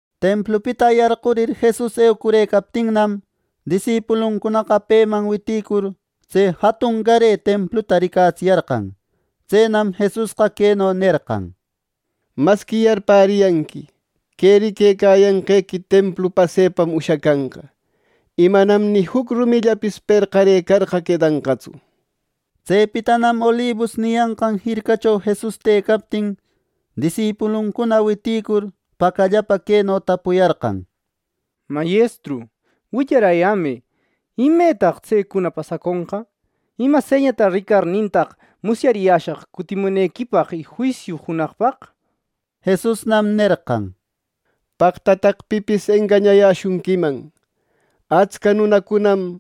Templupita yarqurir Jesus eucurëcaptinnam, disipuluncunaqa peman witïcur tse jatungare templuta ricatsiyarqan. Tsenam Jesusqa queno nerqan: —Masqui yarpäriyanqui, que riquecayanqequi templu pasepam ushacanqa, y manam ni juc rumillapis perqarëcarqa quedanqatsu. Tsepitanam Olibus niyanqan jircacho Jesus tëcaptin, disipuluncuna witïcur, pacallapa queno tapuyarqan: —Mayestru, willarayämë, ¿Imetaq tsecuna pasaconqa? ¿Ima señata ricarnintaq musyariyäshaq cutimunequipaq y juisiu junaqpaq? —nir. Jesusnam nerqan: “¡Paqtataq pipis engañayäshunquiman! Atscaq nunacunam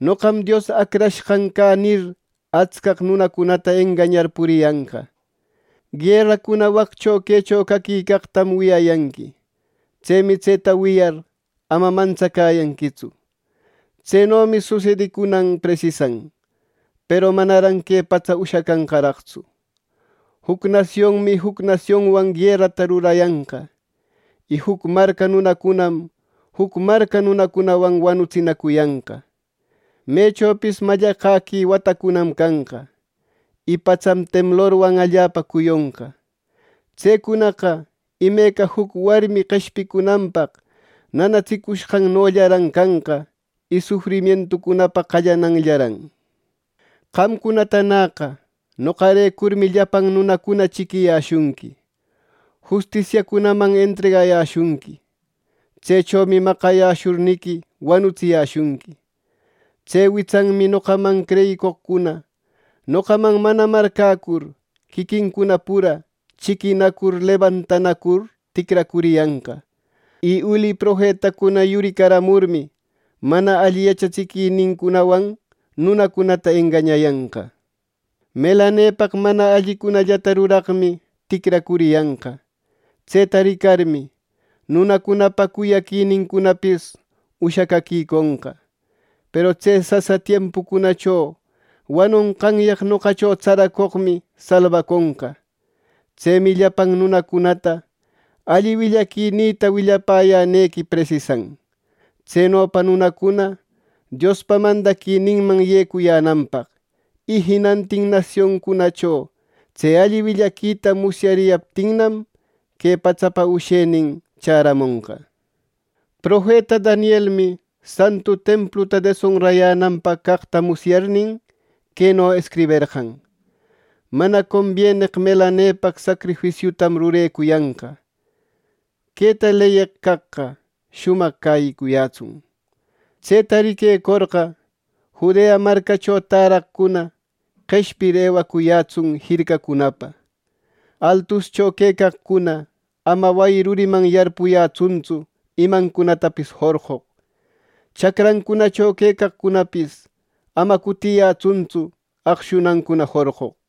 ‘Noqam Dios Acrashqan cä’ nir, atscaq nunacunata engañar puriyanqa. Gueracuna waccho quecho caquicaqtam wiyayanqui. Tsemi tseta wiyar ama mantsacäyanquitsu. Tsenomi susedicunan presisan, peru manaran que patsa ushacanqaraqtsu. Juc nasionmi juc nasionwan guerata rurayanqa. Y juc marca nunacunam juc marca nunacunawan wanutsinacuyanqa. Mechopis mallaqäqui watacunam canqa y patsam temblorwan allapa cuyonqa. Tsecunaqa imeca juc warmi qeshpicunanpaq nanatsicushqannollaran canqa y sufrimientucunapa qallananllaran. “Qamcunatanäqa noqarecurmi llapan nunacuna chiquiyäshunqui; justisiacunaman entregayäshunqui. Tsechomi maqayäshurniqui wanutsiyäshunqui. Tse witsanmi noqaman creyicoqcuna noqaman manana marcäcur, quiquincuna pura chiquinacur, lebantanacur ticracuriyanqa. Y uli profetacuna yuricaramurmi, mana alli yachatsiquinincunawan nunacunata engañayanqa. Melanepaq mana allicunallata ruraqmi ticracuriyanqa. Tseta ricarmi, nunacunapa cuyaquinincunapis ushacäquiconqa. Peru tse sasa tiempucunacho wanonqanyaq noqacho tsaracoqmi salbaconqa. Tsemi llapan nunacunata alli willaquinïta willayänequi presisan; tsenopa nunacuna Diospa mandaquininman yecuyänanpaq, y jinantin nasioncunacho tse alli willaquita musyariyaptinnam, que patsapa ushenin chäramonqa. “Profeta Danielmi santu templuta desonrayänanpaq caqta musyarnin, queno escriberqan, ‘mana combieneq melanepaq sacrifisiuta rurecoqta.’ Queta leyeq caqqa shumaq cäyicuyätsun. Tseta riquecorqa, Judea marcacunacho täraqcuna qeshpir, ewacuyätsun jircacunapa. Altuscho quecaqcuna ama wayi ruriman yarpuyanqatsu imancunatapis jorqoq. Chacrancunacho quecaqcunapis ama cutiyanqatsu aqshunancuna jorqoq.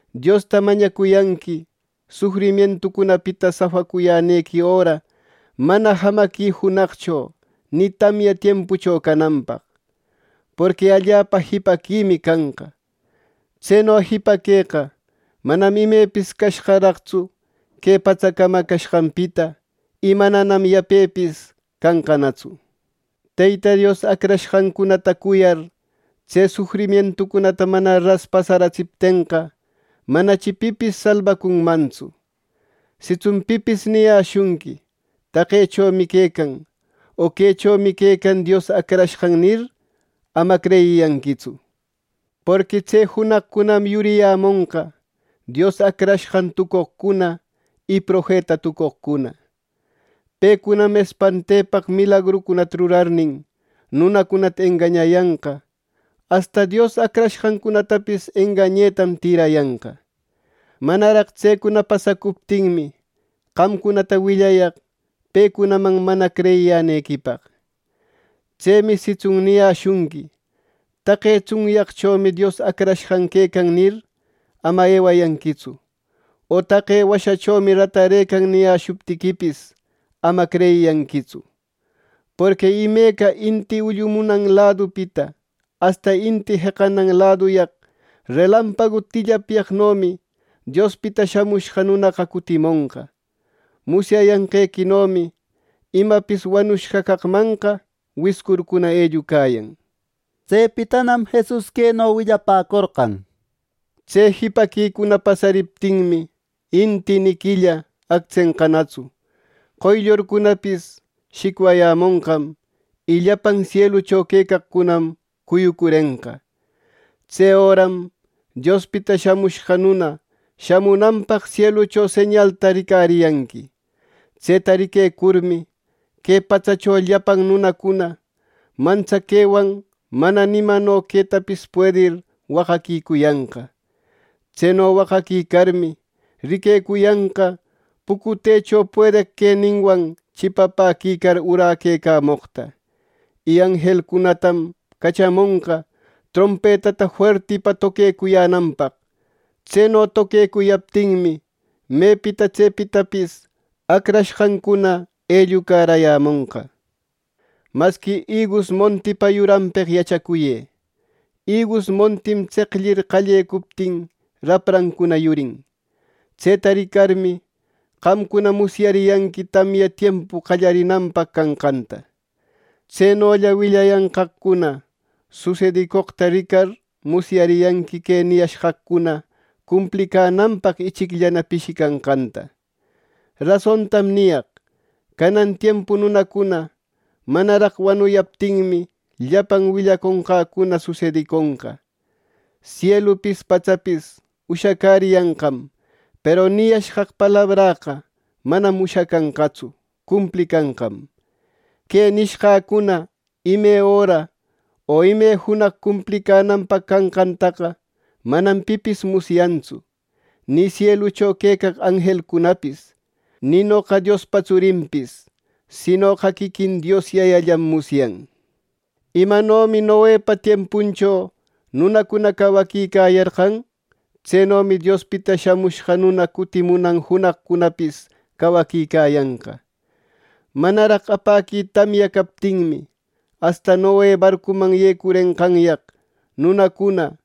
Diosta mañacuyanqui sufrimientucunapita safacuyänequi öra mana jamaqui junaqcho, ni tamya tiempucho cananpaq. Porqui allapa jipaquimi canqa. Tseno jipaqueqa manam imepis cashqaraqtsu que patsa camacashqanpita; y mananam yapepis canqanatsu. Teyta Dios acrashqancunata cuyar tse sufrimientucunata mana ras pasaratsiptenqa, manachi pipis salbacunmantsu. “Sitsun pipis niyäshunqui ‘Taqechomi quecan, o quechomi quecan Dios Acrashqan’ nir, ama creyiyanquitsu. Porqui tse junaqcunam yuriyämonqa Dios Acrashqan tucoqcuna y profeta tucoqcuna. Pecunam espantepaq milagrucunata rurarnin, nunacunata engañayanqa, asta Dios acrashqancunatapis engañetam tïrayanqa. Manaraq tsecuna pasacuptinmi, qamcunata willayaq pecunaman mana creyiyänequipaq. Tsemi sitsun niyäshunqui ‘Taqe tsunyaqchomi Dios Acrashqan quecan’ nir, ama ewayanquitsu, o ‘Taqe washachomi ratarëcan’ niyäshuptiquipis, ama creyiyanquitsu. Porqui imeca inti ullumunan ladupita asta inti jeqanan laduyaq relampagu tillapyaqnomi Diospita Shamushqa Nunaqa cutimonqa. Musyanqequinomi ‘Imapis wanushqa caqmanqa wiscurcuna ellucayan.’” Tsepitanam Jesus queno willapäcorqan: “Tse jipaquicuna pasariptinmi, inti ni quilla actsenqanatsu, qoyllurcunapis shicwayämonqam y llapan sielucho quecaqcunam cuyucurenqa. Tse öram Diospita Shamushqa Nuna shamunanpaq sielucho señalta ricariyanqui. Tseta riquecurmi, que patsacho llapan nunacuna mantsaquewan mana imano quetapis puedir waqaquicuyanqa. Tseno waqaquicarmi, riquecuyanqa pucutecho puedeq queninwan chipapäquicar uraquecamoqta. Y anjelcunatam cachamonqa trompetata fuertipa toquecuyänanpaq. Tseno toquecuyaptinmi, mepita tsepitapis acrashqancuna ellucarayämonqa. “Masqui igus montipa yuranpeq yachacuyë: Igus montim tseqllir qallecuptin raprancuna yurin. Tseta ricarmi, qamcuna musyariyanqui tamya tiempu qallarinanpaq canqanta. Tsenolla willayanqaqcuna susedicoqta ricar musyariyanqui que niyashqaqcuna cumplicänanpaq ichicllana pishicanqanta. Rasontam niyaq: Canan tiempu nunacuna manaraq wanuyaptinmi, llapan willaconqäcuna susediconqa. Sielupis patsapis ushacäriyanqam, peru niyashqaq palabräqa manam ushacanqatsu; cumplicanqam. “Que nishqäcuna ime öra o ime junaq cumplicänanpaq caqtaqa manam pipis musyayantsu, ni sielucho quecaq anjelcunapis, ni noqa Diospa tsurinpis, sinoqa quiquin Dios Yayallam musyan. “Imanomi Noepa tiempuncho nunacuna cawaquicayarqan; tsenomi Diospita Shamushqa Nuna cutimunan junaqcunapis cawaquicayanqa. Manaraq apäqui tamya captinmi, asta Noe barcuman yecurenqanyaq nunacuna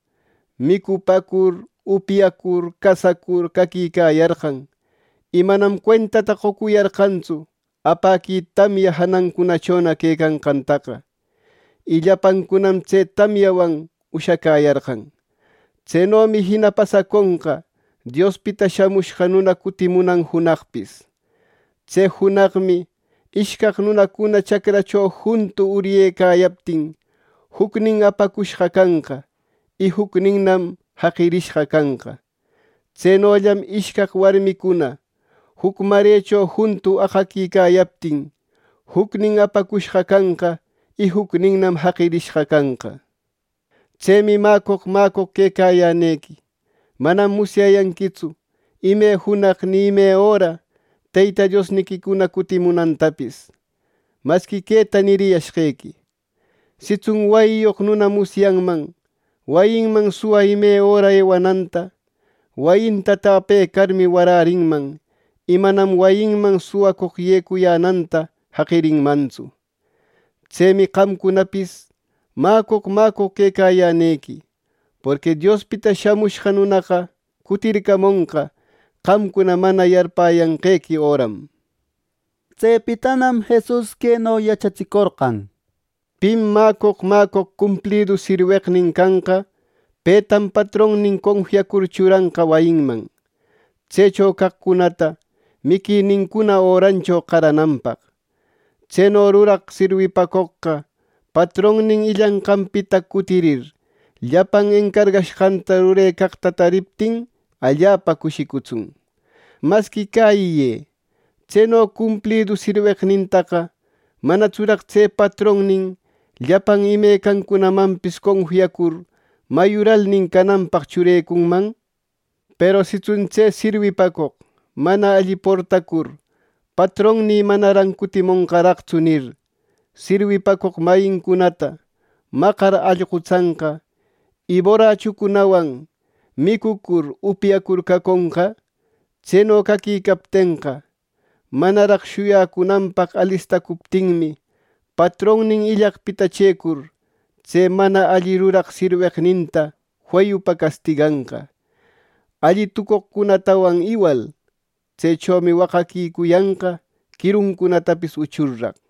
micupäcur, upyacur, casacur caquicayarqan. Y manam cuentata qocuriyarqantsu apäqui tamya janancunachona quecanqantaqa, y llapancunam tse tamyawan ushacäyarqan. Tsenomi jina pasaconqa Diospita Shamushqa Nuna cutimunan junaqpis. Tse junaqmi ishcaq nunacuna chacracho juntu uryecayaptin, jucnin apacushqa canqa, y jucninnam jaqirishqa canqa. Tsenollam ishcaq warmicuna juc marecho juntu aqaquicayaptin, jucnin apacushqa canqa, y jucninnam jaqirishqa canqa. “¡Tsemi mäcoq, mäcoq quecayänequi! Manam musyayanquitsu ime junaq ni ime öra Teyta Diosniquicuna cutimunantapis. Masqui queta niriyashqequi: Sitsun wayiyoq nuna musyanman wayinman suwa ime öra ewananta, wayinta täpecarmi, warärinman y manam wayinman suwacoq yecuyänanta jaqirinmantsu. Tsemi qamcunapis mäcoq, mäcoq quecayänequi; porqui Diospita Shamushqa Nunaqa cutircamonqa qamcuna mana yarpäyanqequi öram.” Tsepitanam Jesus queno yachatsicorqan: “Pim mäcoq, mäcoq, cumplidu sirweqnin canqa petam patronnin confiacur churanqa wayinman, tsecho caqcunata miquinincuna örancho qarananpaq. Tseno ruraq sirwipacoqqa patronnin illanqanpita cutirir, llapan encarqashqanta rurecaqta taririptin allapa cushicutsun. Masqui cäyiyë: Tseno cumplidu sirweqnintaqa ¿manatsuraq tse patronnin llapan imecancunamanpis confiacur mayuralnin cananpaq churecunman! Peru sitsun tse sirwipacoq mana alli portacur ‘Patronnï manaran cutimonqaraqtsu’ nir, sirwipacoq mayincunata maqar allqutsanqa, y borachucunawan micucur upyacur caconqa, tseno caquicaptenqa, manaraq shuyacunanpaq alistacuptinmi, patronnin illaqpita chëcur, tse mana alli ruraq sirweqninta feyupa castiganqa, alli tucoqcunatawan iwal. Tsechomi waqaquicuyanqa, quiruntapis uchurraq.